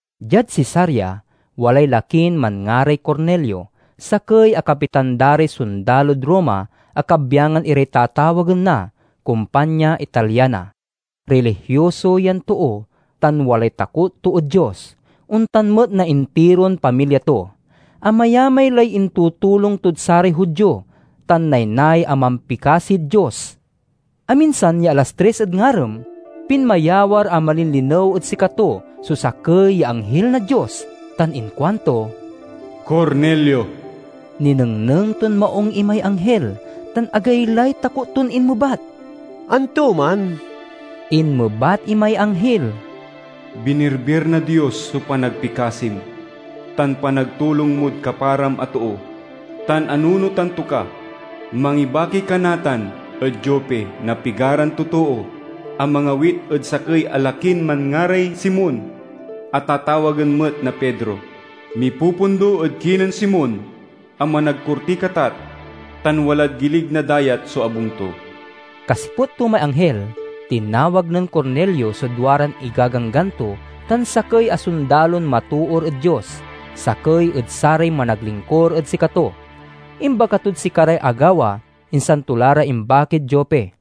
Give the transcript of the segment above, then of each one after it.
Diad Cesarea walay lakin manngaray Cornelio, sakey a kapitan da ray sondalod Roma a kabyangan iray tatawagen na "Kompanya Italiana." Rilihioso yan too tan walay takot to ed Dios; ontan met na intiron pamilya to. Amayamay lay intutulong tod saray Judio, tan naynay a mampikasid Dios. Aminsan ya alas tris ed ngarem, pinmayawar a malinlinew ed sikato so sakey ya anghil na Dios tan inkuanto, "Cornelio!" Ninengneng ton maung imay anghil tan agaylay takot ton inmebat, "Antoman?" Inmebat imay anghil, "Binirbir na Dios so panagpikasim tan panagtulong mod kaparam a too, tan anunotan to ka. Mangibaki ka natan ed Jope na pigaran totoo a mangawit ed sakey a lakin manngaray Simon a tatawagen met na Pedro. Mipupundo ed kinen Simon a managkurtiy katat tan walad gilig na dayat so abung to." Kasiput to may anghil, tinawag nen Cornelio so duaran igaganggan to tan sakey a sondalon matoor ed Dios, sakey ed saray managlingkur ed sikato. Imbaga tod sikaray agawa, insan to la ra imbakid Jope.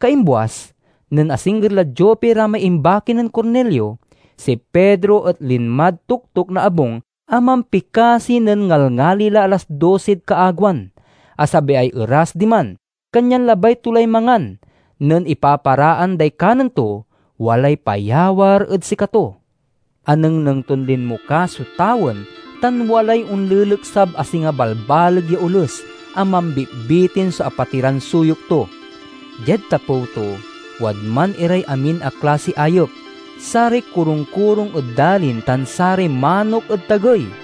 Kaimbuas, nen asingger lad Jope ra may imbaki nen Cornelio, si Pedro et linmad toktok na abung a mampikasi nen ngalngali la alas dosid kaagewan. Asabiay eras diman, kanyan labay to lay mangan. Nen ipaparaan day kanen to, walay payawar ed sikato. Anengneng ton linmokas so tawen tan walay onleleksab a singa balbaleg ya oles a mambitbitin so apatiran suyok to. Diad tapew to wadman iray amin a klasiy ayep: saray korung-korung ed dalin tan saray manok ed tagey.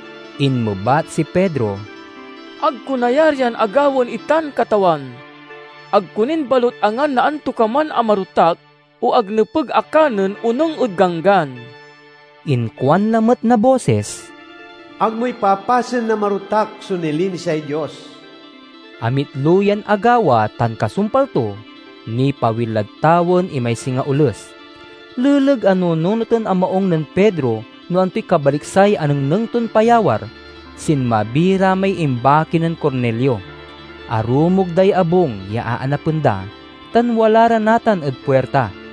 Inmebat si Pedro, "Ag ko nayarian a gawaen itan, Katawan! Ag ko nin balut angan na antokaman a marotak o ag nepeg a kanen onung ed ganggan." Inkuan lamet na bosis, "Ag mo ipapasen a marotak so nilinisay Dios." Amitlo yan agawa tan kasumpal to, nipawil lad tawen imay singa oles. Leleg a nununoten a maung nen Pedro no antoy kabaliksay anengneng ton payawar, sinmabi ra may imbaki nen Cornelio. Arumog day abung ya aanapen da, tan wala ra natan ed puirta.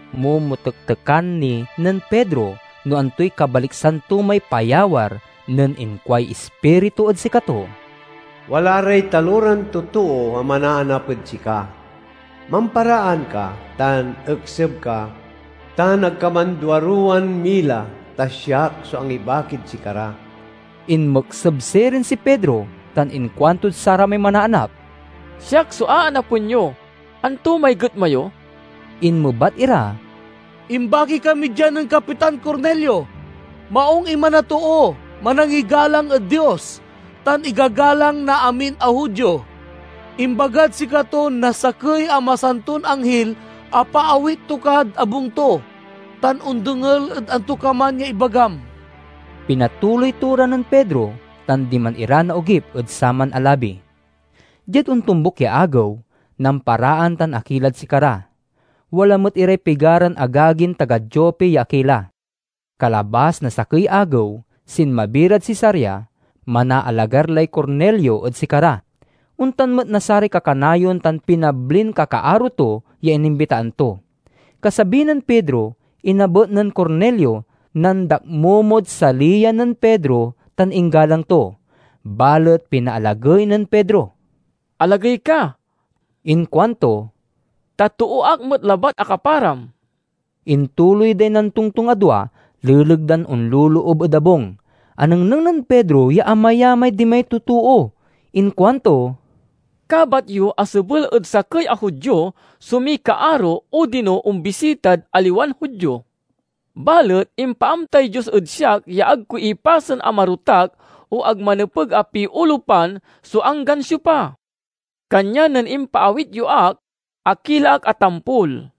Momotektekan ni nen Pedro no antoy kabaliksan to may payawar nen inkuay Ispiritu ed sikato, "Wala ray taloran totoo a manaanap ed sika. Mamparaan ka tan ekseb ka, tan ag ka manduaruwan mila, ta siak so angibakid sikara." Inmekseb sirin si Pedro tan inkuantod saramay manaanap, "Siak so aanapen yo. Anto may getma yo?" Inmebat ira, "Imbaki kami dia nen Kapitan Cornelio. Maung iman a too, manangigalang ed Dios, tan igagalang na amin a Judio. Imbagad sikato na sakey a masanton anghil a paawit to kad abung to, tan ondengel ed antokaman ya ibagam." Pinatuloy to ra nen Pedro, tan diman ira naogip ed saman a labi. Diad ontombuk ya agew, namparaan tan akilad sikara. Wala met iray pigaran agagin taga Jope ya akila. Kalabas na sakey agew, sinmabi rad Cesarea. Manaalagar lay Cornelio ed sikara, ontan met na saray kakanayon tan pinablin kakaaro to ya inimbitaan to. Kasabi nen Pedro, inabet nen Cornelio, nandakmomod saliyan nen Pedro tan inggalang to. Balet pinaalagey nen Pedro. "Alagey ka," inkuanto, "ta too ak met labat a kaparam." Intuloy day nantongtong a dua leleg dan onloloob ed abung. Anengneng nen Pedro ya amayamay dimay totoo. Inkuanto, "Kabat yo a sebel ed sakey a Judio so mikaaro odino ombisitad aliwan Judio. Balet impaamtay Dios ed siak ya ag ko ipasen a marotak o ag manepeg a piolupan so anggan siopa. Kanyan nen impaawit yo ak, akila ak a tampol.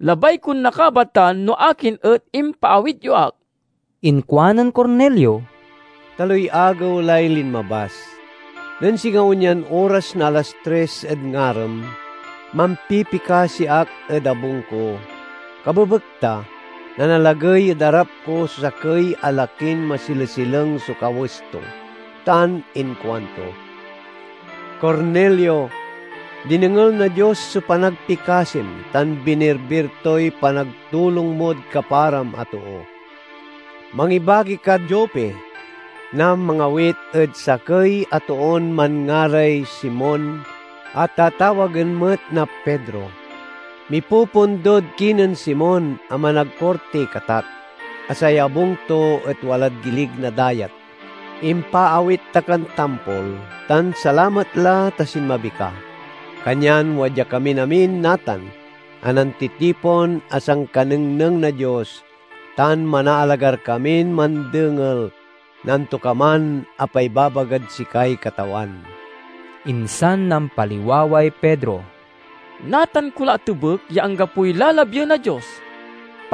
Labay kon nakabatan no akin et impaawit yo ak." Inkuanen Cornelio, "Taloy agew lay linmabas. Nen singa onyan oras na alas tris ed ngarem, mampipikasi ak ed abung ko. Kabebekta, nanalagey ed arap ko so sakey a lakin masilesileng so kawes to tan inkuanto, 'Cornelio, dinengel na Dios so panagpikasim tan binirbir toy panagtulong mod kaparam a too. Mangibaki kad Jope na mangawit ed sakey a toon manngaray Simon a tatawagen met na Pedro. Mipupundod kinen Simon a managkurtiy katat, a say abung to et walad gilig na dayat.' Impaawit ta kan tampol, tan salamat la ta sinmabi ka. Kanyan wadya kamin amin natan a nantitipon a sankanengneng na Dios tan manaalagar kamin mandengel na antokaman a paibabagad sikay Katawan." Insan nampaliwaway Pedro: "Natan ko la atebek ya anggapoy lalabien na Dios.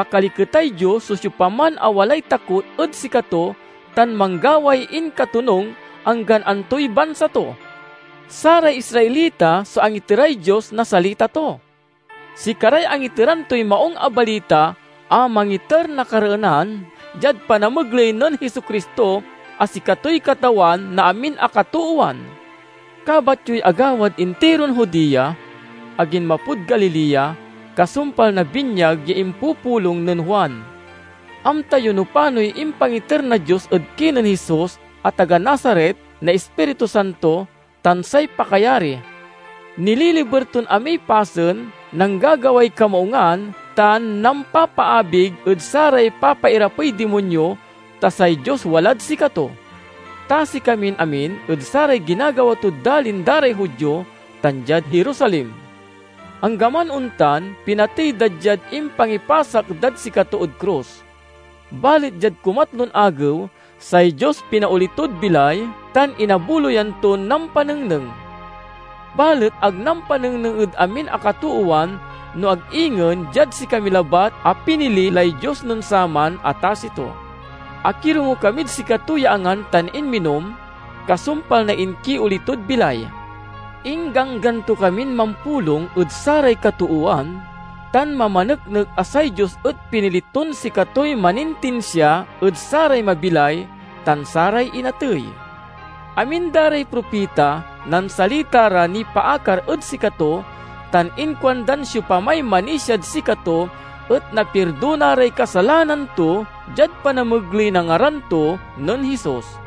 Pakaliketay Dios so siopaman a walay takot ed sikato tan manggaway inkatonung, anggan antoy bansa to. Saray Israelita so angiteray Dios na salita to. Sikaray angiteran toy Maung a Balita, a mangiter a kareenan diad panamegley nen Jesu-Cristo, a sikatoy Katawan na amin a katoowan! Kabat yoy agawad intiron Judea, a ginmapod Galilea, kasumpal na binyag ya impupulong nen Juan. Amta yo no panoy impangiter na Dios ed kinen Jesus a taga Nazaret na Ispiritu Santo tan say pakayari. Nililiber ton amiy pasen, nanggagaway kamaungan tan nampapaabig ed saray papairapey dimonyo, ta say Dios walad sikato. Tasi kamin amin ed saray ginagawa tod dalin da ray Judio tan diad Jerusalem. Anggaman ontan, pinatey da diad impangipasak dad sikato ed krus. Balet diad kumatlon agew, say Dios pinaoli tod bilay tan inabuloyan ton nampanengneng. Balet ag nampanengneng ed amin a katoowan no ag ingen diad sikami labat a pinili lay Dios nen saman a tasi to. Akirongo kamid sikato ya angan tan inminom, kasumpal na inkioli tod bilay. Ingganggan to kamin mampulong ed saray katoowan, tan mamaneknek a say Dios et pinili ton sikatoy manintinsia ed saray mabilay tan saray inatey. Amin da ray propita nansalita ra nipaakar ed sikato, tan inkuandan siopamay manisiad sikato et napirdona ray kasalanan to diad panamegley na ngaran to nen Jesus."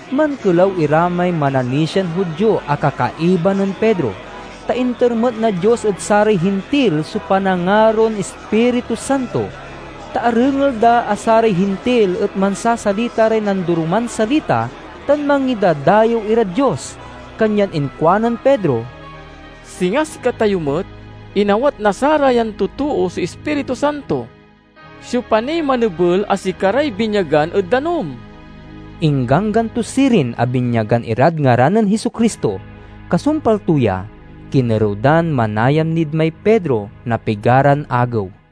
Mankelaw ira may mananisian Judio a kakaiba nen Pedro, ta inter met na Dios ed saray Hintil so panangaron Ispiritu Santo. Ta arengel da a saray Hintil et mansasalita ray nandoroman salita tan mangidadayew irad Dios. Kanyan inkuanen Pedro, "Singa sikatayo met, inawat na sarayan totoo so Ispiritu Santo. Siopa niy manebel a sikaray binyagan ed danum?" Ingganggan to sirin a binyagan irad ngaran nen Jesu-Cristo. Kasumpal to ya, kinerew dan manayam nid may Pedro na pigaran agew.